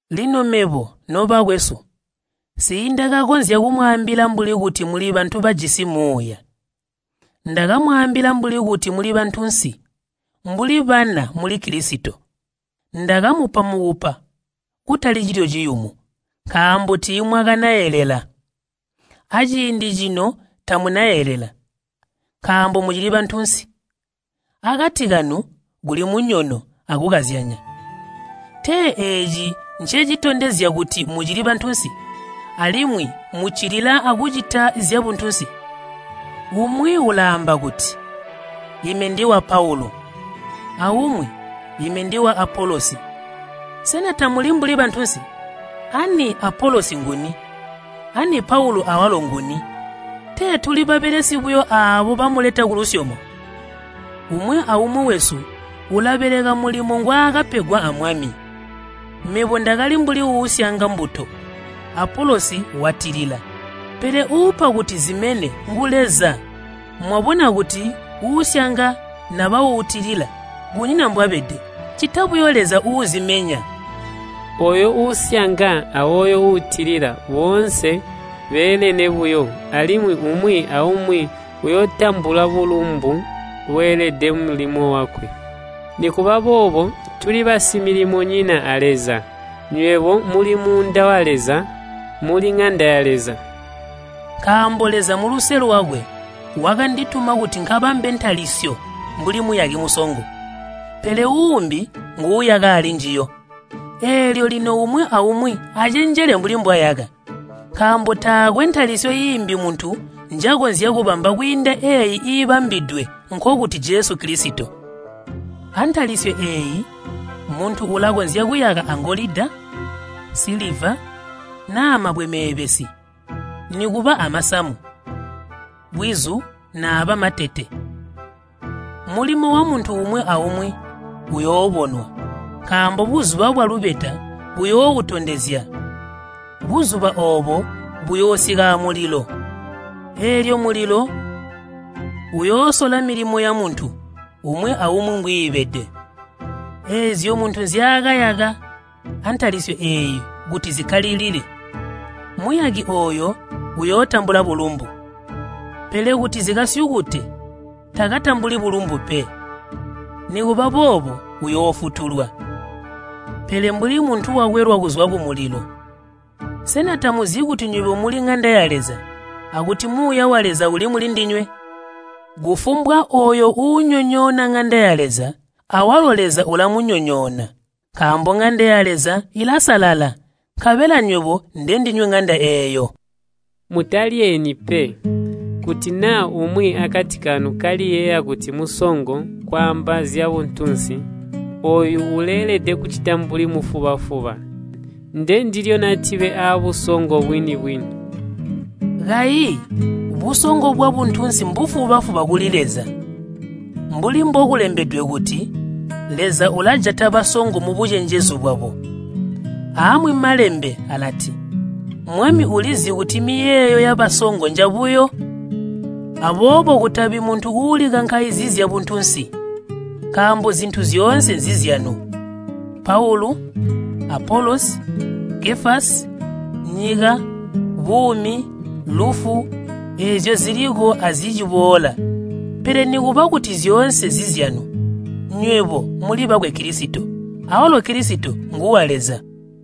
Lino mebo, nobakwesu, nsiindakakonzya kumwaambila mbuli kuti muli bantu bajisi Muuya, ndakamwaambila mbuli kuti muli bantunsi, mbuli bana muli Kilisito. Ndakamupa mukupa kutali cilyo ciyumu, nkaambo tiimwakanaelela. Aciindi cino tamunaelela, nkaambo mucili bantunsi. Akati kanu kuli munyono akukazyanya. Tee eeci ncecitondezya kuti mucili bantunsi, alimwi muccilila akucita zyabuntunsi? Umwi ulaamba kuti, “Ime ndiwa Paulu,” aumwi, “Ime ndiwa Apolosi,” sena tamuli mbuli bantunsi? Ani Apolosi nguni? Ani Paulu awalo nguni? Tee tuli babelesi buyo aabo bamuleta kulusyomo. Umwi aumwi wesu ulabeleka mulimo ngwaakapegwa a Mwami. Mebo ndakali mbuli uusyanga mbuto Apolosi watilila, pele uupa kuti zimene ngu Leza. Mwabona kuti uusyanga naba uutilila kunyina mbwabede, ccita buyo Leza uuzimenya. Ooyo uusyanga ayooyo uutilila, boonse beelene buyo, alimwi umwi aumwi uyootambula bulumbu bweelede mulimo wakwe. Nikuba boobo tuli basimilimonyina a Leza, nywebo muli muunda wa Leza. Muli ŋanda ya Leza. Nkaambo Leza muluse lwakwe wakandituma kuti nkabambe ntalisyo mbuli muyaki musongo, pele uumbi nguuyaka alinjiyo. Eelyo lino umwi aumwi acenjele mbuli mbwayaka. Nkaambo taakwe ntalisyo iimbi muntu njakonzya kubamba kwiinda eeyi iibambidwe, nkokuti Jesu Kilisito. Antalisyo eeyi muntu ulakonzya kuyaka angolida, nsiliva, naa mabwe meebesi, nikuba amasamu, bwizu naaba matete. Mulimo wamuntu umwi aumwi uyoobonwa, nkaambo buzuba bwalubeta buyooutondezya. Buzuba oobo buyoosika amulilo, eelyo mulilo uyoosola milimo yamuntu umwi aumwi mbwiibede. Eezyo muntu nzyaakayaka antalisyo eeyi kuti zikakkalilile, muyaki ooyo uyootambula bulumbu. Pele kuti zikasyukute, takatambuli bulumbu pe, nikuba boobo uyoofutulwa, pele mbuli muntu wakwelwa kuzwa kumulilo. Sena tamuzi kuti nywebo muli ŋanda ya Leza, akuti Muuya wa Leza uli mulindinywe? Kufumbwa ooyo uunyonyoona ŋanda ya Leza, awalo Leza ulamunyonyoona. Nkaambo ŋanda ya Leza ilasalala, nkabela nywebo ndendinywe ŋanda eeyo. Mutalyeeni pe. Kuti naa umwi akati kanu kaliyeeya kuti musongo kwaamba zyabuntunsi, ooyo uleelede kulicita mbuli mufuba-fuba, ndendilyo natibe aabusongo bwini-bwini. Kayi busongo bwabuntunsi mbufuba-fuba buyo kuli Leza. Mbuli mbokulembedwe kuti, “Leza ulajata basongo mubucenjezu bwabo.” Aamwi Malembe alati, “Mwami ulizi kuti miyeeyo yabasongo njabuyo.” Aboobo kutabi muntu uulikankaizizya buntunsi. Nkaambo zintu zyoonse nzizyanu, Paulu, Apolosi, Kefasi, nyika, buumi, lufu, eezyo ziliko aziciboola. Pele nikuba kuti zyoonse nzizyanu, nywebo muli bakwe Kilisito, awalo Kilisito nguwa Leza.